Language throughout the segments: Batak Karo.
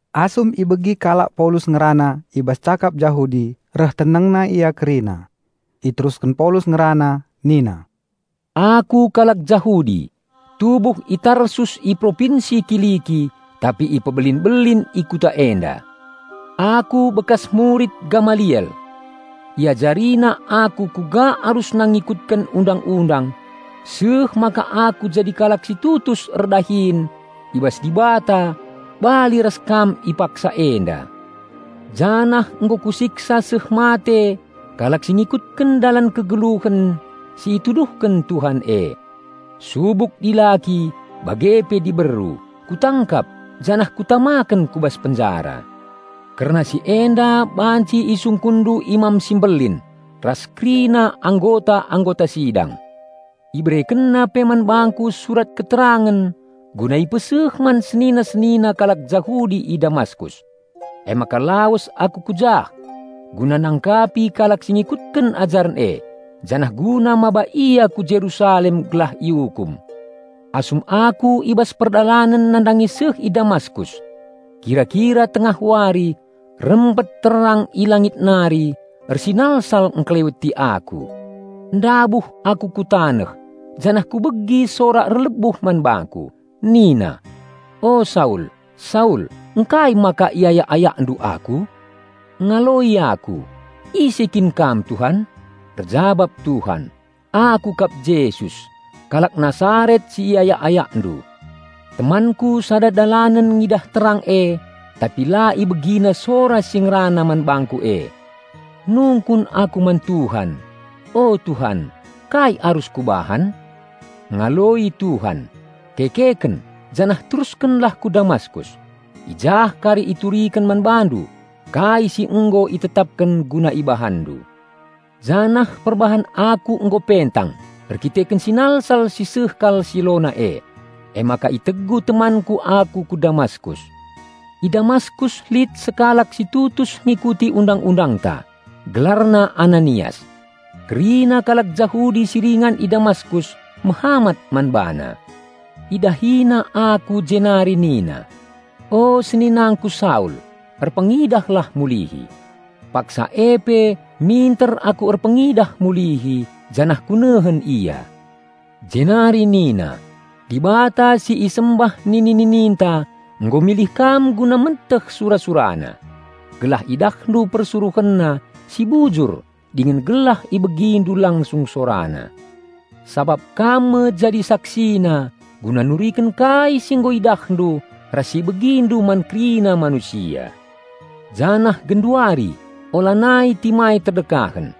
Asum ibegi kalak Paulus ngerana i bas cakap Jahudi reh tenengna ia kerina. Iterusken Paulus ngerana nina, "Aku kalak Jahudi, tubuh i Tarsus i Propinsi Kiliki tapi ipebelin-belin i kuta enda. Aku bekas murid Gamaliel. Iajarina aku kuga arusna ngikutken Undang-undang seh maka aku jadi kalak si tutus erdahin i bas Dibata bali ras kam i paksa enda. Janah nggo kusiksa seh mate kalak si ngikutken Dalan Kegeluhen si ituduhken Tuhan e. Subuk dilaki bage pe diberu kutangkap janah kutamaken ku bas penjara. Kerna si enda banci isungkunndu Imam si Mbelin ras kerina anggota-anggota sidang. Iberekenna pe man bangku surat keterangen guna ipeseh man senina-senina kalak Jahudi i Damaskus. Emaka lawes aku ku jah, guna nangkapi kalak si ngikutken ajaren e, janah guna maba ia ku Jerusalem gelah iukum." "Asum aku i bas perdalanen nandangi seh i Damaskus, kira-kira tengah wari, rempet terang i langit nari ersinalsal engkeleweti aku. Ndabuh aku ku taneh janah kubegi sora erlebuh man bangku, nina, 'O Saul, Saul, ngkai maka iayak-ayakndu Aku?' Ngaloi aku, 'Ise kin kam Tuhan?' Erjabap Tuhan, 'Aku kap Jesus, kalak Nasaret si iayak-ayakndu.' Temanku sada dalanen ngidah terang e tapi la ibegina sora si ngerana man bangku e. Nungkun aku man Tuhan, 'O Tuhan, kai arus kubahan?' Ngaloi Tuhan, 'Kekeken janah teruskenlah ku Damaskus. I jah kari ituriken man bandu kai si nggo itetapken guna ibahanndu.' Janah perbahan aku nggo pentang erdandanken sinalsal si sehkal silona e, emaka itegu temanku aku ku Damaskus. I Damaskus lit sekalak si tutus ngikuti Undang-undangta, gelarna Ananias. Kerina kalak Jahudi si ringan i Damaskus mehamat man bana. Idahina aku jenari nina, 'O seninangku Saul, erpengidahlah mulihi.' Paksa e pe minter aku erpengidah mulihi janah kunehen ia. Jenari nina, 'Dibata si isembah nini-nininta nggo milih kam guna meteh sura-SuraNa. Gelah idahndu PersuruhenNa si Bujur dingen gelah ibegindu langsung SoraNa. Sabap kam me jadi SaksiNa guna nuriken kai si nggo idahndu ras si ibegindu man kerina manusia. Janah genduari, ulanai timai terdekahen.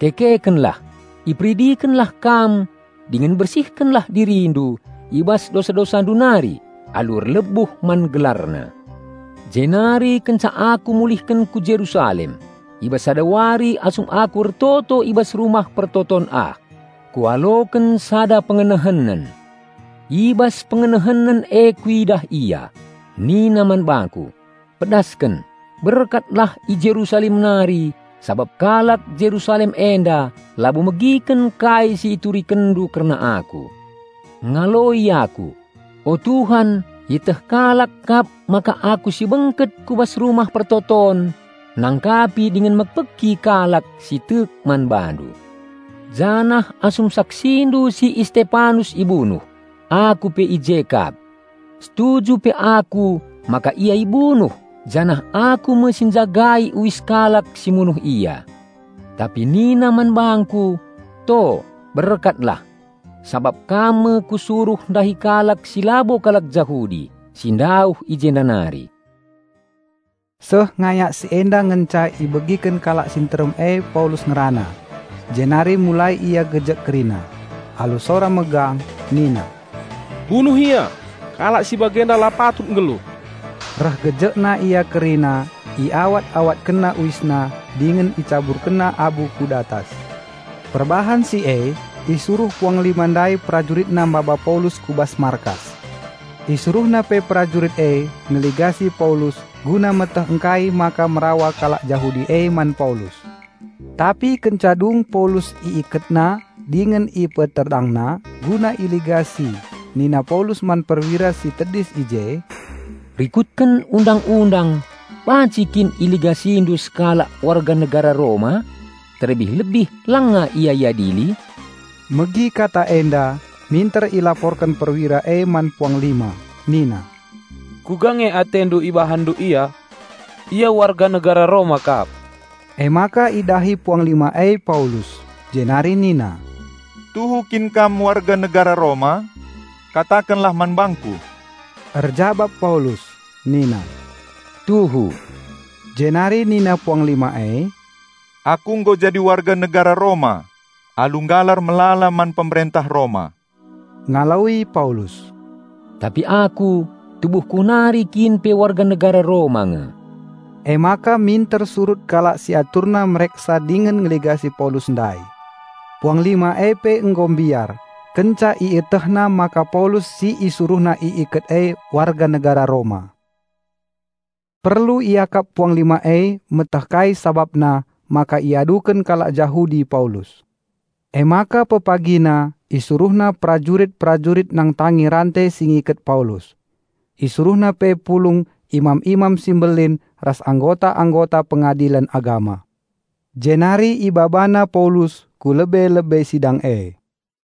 Kekekenlah, iperidikenlah kam dingen bersihkenlah dirindu i bas dosa-dosandu nari alu erlebuh man GelarNa.'" "Jenari kenca aku mulihken ku Jerusalem, i bas sada wari asum aku ertoto i bas Rumah Pertoton ah, kualoken sada pengenehenen. I bas pengenehenen e kuidah Ia. Nina man bangku, 'Pedasken, berkatlah i Jerusalem nari sabap kalak Jerusalem enda labo megiken kai si iturikenndu kerna Aku.' Ngaloi aku, 'O Tuhan ieteh kalak kap maka aku si bengket ku bas rumah persembahen nangkapi dingen mekpeki kalak si tek man BaNdu. Janah asum saksindu si Istepanus ibunuh, aku pe i je kap. Setuju pe aku maka ia ibunuh janah aku me si njagai uis kalak si munuh ia.' Tapi nina man bangku, 'To, berkatlah, sabap kam me Kusuruh ndahi kalak si labo kalak Jahudi si ndauh i jenda nari.'" Seh ngayak si enda ngenca ibegiken kalak si nterem e Paulus ngerana. Jenari mulai ia gejek kerina. Alu sora megang nina, "Bunuh ia! Kalak si bagenda la patut nggeluh!" Reh gejekna ia kerina, iawat-awatkenna uisna dingen icaburkenna abu ku datas. Perbahan si e isuruh puanglima ndai perajuritna maba Paulus ku bas markas. Isuruhna pe perajurit e ngeligasi Paulus guna meteh ngkai maka merawa kalak Jahudi e man Paulus. Tapi kenca dung Paulus iiketna dingen ipeterdangna guna iligasi nina Paulus man perwira si tedis i je, "Rikutken undang-undang banci kin iligasindu sekalak warga negara Roma, terlebih-lebih langa ia iadili?" Megi kata enda minter ilaporken perwira e man puanglima nina, "Kuga nge atendu ibahanndu ia? Ia warga negara Roma kap." Emaka idahi puanglima e Paulus, jenari nina, "Tuhu kin kam warga negara Roma? Katakenlah man bangku!" Erjabap Paulus nina, "Tuhu." Jenari nina puanglima e, "Aku nggo jadi warga negara Roma alu nggalar melala man pemerentah Roma." Ngaloi Paulus, "Tapi aku, tubuhku nari kin pe warga negara Roma nge." Emaka minter surut kalak si aturna mereksa dingen ngeligasi Paulus ndai. Puanglima e pe nggo mbiar kenca ietehna maka Paulus si isuruhna iiket e warga negara Roma. Perlu iakap puanglima e meteh kai sabapna maka iaduken kalak Jahudi Paulus. Emaka pepagina isuruhna perajurit-perajurit nangtangi rante si ngiket Paulus. Isuruhna pe pulung imam-imam si mbelin ras anggota-anggota Pengadilen Agama. Jenari ibabana Paulus ku lebe-lebe sidang e.